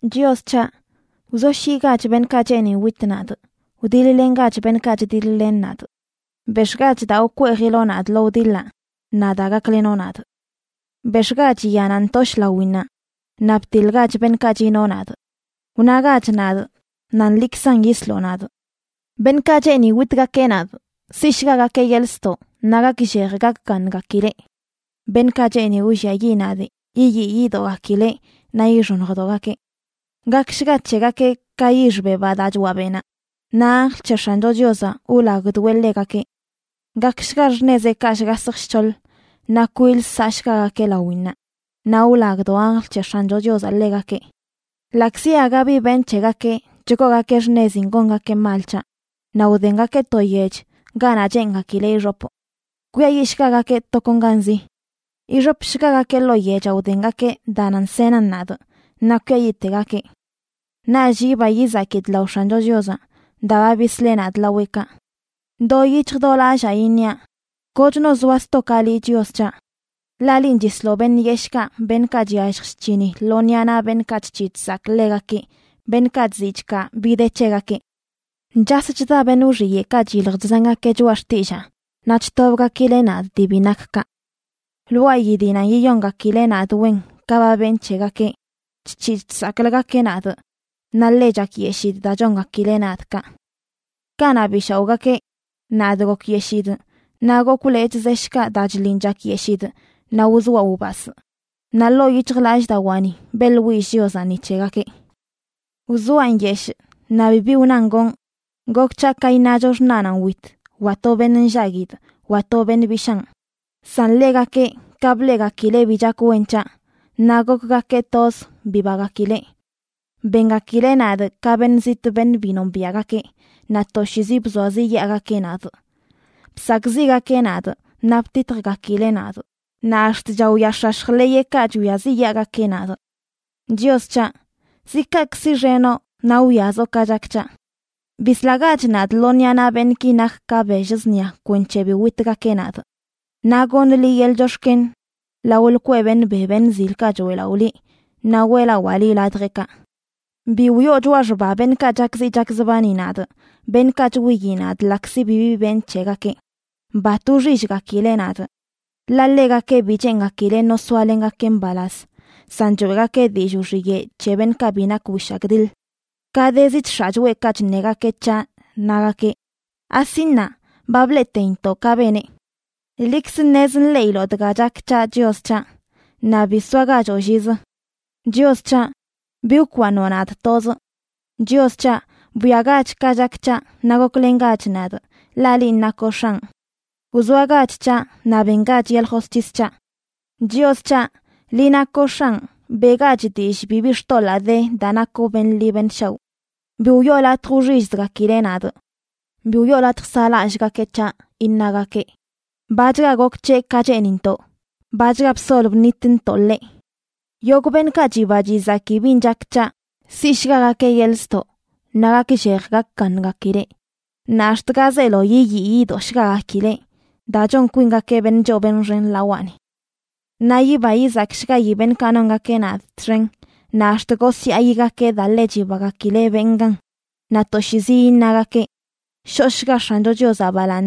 Chios c̱haꞌ, wzoshyiꞌgach beṉꞌkaꞌ cheeni wit nadꞌ; wdiḻ-lengach beṉꞌkaꞌ chdiḻ-len nadꞌ. Bex̱ꞌgach daa wkweejiloꞌ nadꞌ lo wdiḻaꞌ naꞌ da, gaklenoꞌ nadꞌ. Bex̱ꞌgach yanaꞌ ntoshꞌ lawinnaꞌ naꞌ btiḻgach beṉꞌkaꞌ chino nadꞌ. Wnagach nadꞌ nan liꞌkzan yisloꞌ nadꞌ. Beṉꞌkaꞌ cheeni witgakeꞌ nadꞌ siꞌshgagakeꞌ yeḻꞌ ztoꞌ naꞌ gakllej gakgaṉgakileꞌ; beṉꞌkaꞌ cheeni wlliayiꞌ nadꞌ yiyii yidogakileꞌ naꞌ yixoṉjdogakeꞌ. Gakshga c̱hegakeꞌ ka yix bebaꞌ daa choaꞌ beꞌnaꞌ, naꞌ anjl c̱he X̱ancho Chiozaꞌ wlagdoeꞌ ḻegakeꞌ. Gakshga xṉezeꞌkaꞌ shgasj shc̱hoḻ naꞌ kwil saꞌshgagakeꞌ lawinnaꞌ, naꞌ wlagdo anjl c̱he X̱ancho Chiozaꞌ ḻegakeꞌ. Ḻaꞌkzi aga bi benꞌ c̱hegakeꞌ chgoogakeꞌ xṉezin gongakeꞌ mal c̱haꞌ, naꞌ wdengakeꞌ to yech ganaꞌ cheengakileꞌ ixopꞌ. ¡Kwiayiꞌshgagakeꞌ tokonganzi! Ixopshgagakeꞌ ḻoo yechaꞌ wdengakeꞌ daa nan senan nadꞌ, naꞌ kwiayiꞌtegakeꞌ. Naꞌch yiba yizakidꞌ lao X̱ancho Chiozaꞌ daa ba bisleꞌ nadꞌ laweꞌkaꞌ. Do yic̱hj do lallaa iṉiaꞌ: “Kochno zoa sto ka liꞌ, Chios c̱haꞌ.” Ḻaꞌ linꞌ chisloꞌ beṉꞌ yeshꞌkaꞌ, beṉꞌkaꞌ chyallj chc̱hini lo ṉiꞌa naꞌ beṉꞌkaꞌ chc̱hiꞌ chsakꞌ ḻegakeꞌ, beṉꞌkaꞌ chziꞌ chkaa bi de c̱hegakeꞌ. Chas chda beṉꞌ wxiyeꞌkaꞌ chyilj chzangakeꞌ choꞌa xtillaa, naꞌ chtobgakileꞌ nadꞌ dii bi nak kaꞌ. Lwaayi dii nan yiyongakileꞌ nadꞌ wen ka ba benꞌ c̱hegakeꞌ, chc̱hiꞌ chsakꞌləgakeꞌ nadꞌ, naꞌ ḻe chakyeshidꞌ daa chongakileꞌ nadꞌ kaꞌ. Kanaꞌ bi shaoꞌgakeꞌ, nadꞌ gokyeshidꞌ naꞌ gokwꞌ lechꞌ zeshꞌkaꞌ daa chliꞌn chakyeshidꞌ naꞌ wzoaꞌ wbasꞌ, naꞌ ḻoo yic̱hjlallꞌdawaani beꞌḻwillꞌ Chiozaꞌ ni c̱hegakeꞌ. Wzoaꞌ nyeshꞌ naꞌ bibi wnan gonꞌ, gok c̱haꞌ ka iṉacho xṉaꞌnanꞌ wit, wa to beṉꞌ nllaguidꞌ, wa to beṉꞌ bishaan. San ḻegakeꞌ, ka bleꞌgakileꞌ bi chak wen c̱haꞌ, naꞌ gokgakeꞌ toz bibagakileꞌ. Bengakileꞌ nadꞌ ka beṉꞌ zitꞌ beṉꞌ bi nombiaꞌgakeꞌ, naꞌ toshiizi bzoaziꞌyaagakeꞌ nadꞌ. Bsakꞌziꞌgakeꞌ nadꞌ naꞌ btitjgakileꞌ nadꞌ, naꞌ ax̱t chaoyaax̱ax̱j ḻeyeꞌkaꞌ chwiaziꞌyaagakeꞌ nadꞌ. Chios c̱haꞌ, ¿zi kaꞌkꞌ siꞌxenoꞌ naꞌ wwiazoꞌ ka chak c̱haꞌ? Bislagach nadꞌ lo ṉiꞌa naꞌ beṉꞌki nak ka bell zṉia kwenc̱he bi witgakeꞌ nadꞌ. Naꞌ goṉꞌ liꞌ yeḻꞌ chox̱ken lao lkweꞌ beṉꞌ be beṉꞌ zilkaꞌ choeꞌlaꞌo liꞌ. Naꞌ weꞌlawaa liꞌ ladjeꞌkaꞌ. Bi wiꞌo choꞌa xba beṉꞌkaꞌ chakziꞌ chakzbani nadꞌ, beṉꞌkaꞌ chwiyi nadꞌ ḻaꞌkzi bibi benꞌ c̱hegakeꞌ. Bat wxillgakileꞌ nadꞌ. Ḻaꞌ ḻegakeꞌ bi cheengakileꞌ no soalengakeꞌ mbalaz, san choeꞌgakeꞌ dillꞌ wxiyeꞌ c̱he beṉꞌkaꞌ bi nak wishagdiḻ. Kadezi chx̱aꞌ choꞌekaꞌ chṉegakeꞌ c̱haꞌ, nagakeꞌ: “Asi ṉaa, ba bleꞌteintoꞌ ka beneꞌ.” Liꞌkz ṉez nḻeꞌiloꞌ dga chak c̱haꞌ, Chios c̱haꞌ, naꞌ bi soagachoꞌ llizə. Chios c̱haꞌ, bi wkwaaṉoꞌ nadꞌ tozꞌ. Chios c̱haꞌ, bwiagach ka chak c̱haꞌ, naꞌ goklengach nadꞌ, ḻaꞌ linꞌ nakoꞌ X̱anꞌ. Wzoagach c̱haꞌ naꞌ bengach yeḻꞌ josc̱his c̱haꞌ. Chios c̱haꞌ, liꞌ nakoꞌ X̱anꞌ, beꞌgach dillꞌ bibi xtoḻaa de daa nakoꞌ beṉꞌ ḻi beṉꞌ shaoꞌ. Bi wiꞌo latj wxillzgakileꞌ nadꞌ. Bi wiꞌo latj saꞌlallꞌgakeꞌ c̱haꞌ, iṉagakeꞌ: “Bachga gok c̱heꞌ ka cheenintoꞌ. Bachga bsol bṉitntoꞌ ḻeꞌ.” Yogꞌ beṉꞌkaꞌ chiba chizaki bin chak c̱haꞌ, siꞌshgagakeꞌ yeḻꞌ ztoꞌ naꞌ gakllej gakgaṉgakileꞌ, naꞌ ax̱t ga zeelo yiyii yidoꞌshgagakileꞌ daa chon kwingakeꞌ beṉꞌ choo beṉꞌ xen lawaꞌni. Naꞌ yiba yizakshgayi beṉꞌkaꞌ nongakeꞌ nadꞌ txen, naꞌ ax̱t gosyaayigakeꞌ daa ḻe chibagakileꞌ benꞌ gan. Naꞌ toshiizi iṉagakeꞌ: “Shoꞌshga X̱ancho Chiozaꞌ balaaṉ,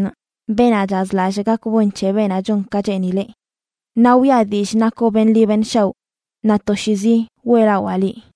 beenaꞌ chazlallꞌ gak wen c̱he beenaꞌ chon ka cheenileꞌ.” Naꞌ wiꞌa dillꞌ nakoꞌ beṉꞌ ḻi beṉꞌ shaoꞌ; naꞌ toshiizi weꞌlawaa liꞌ.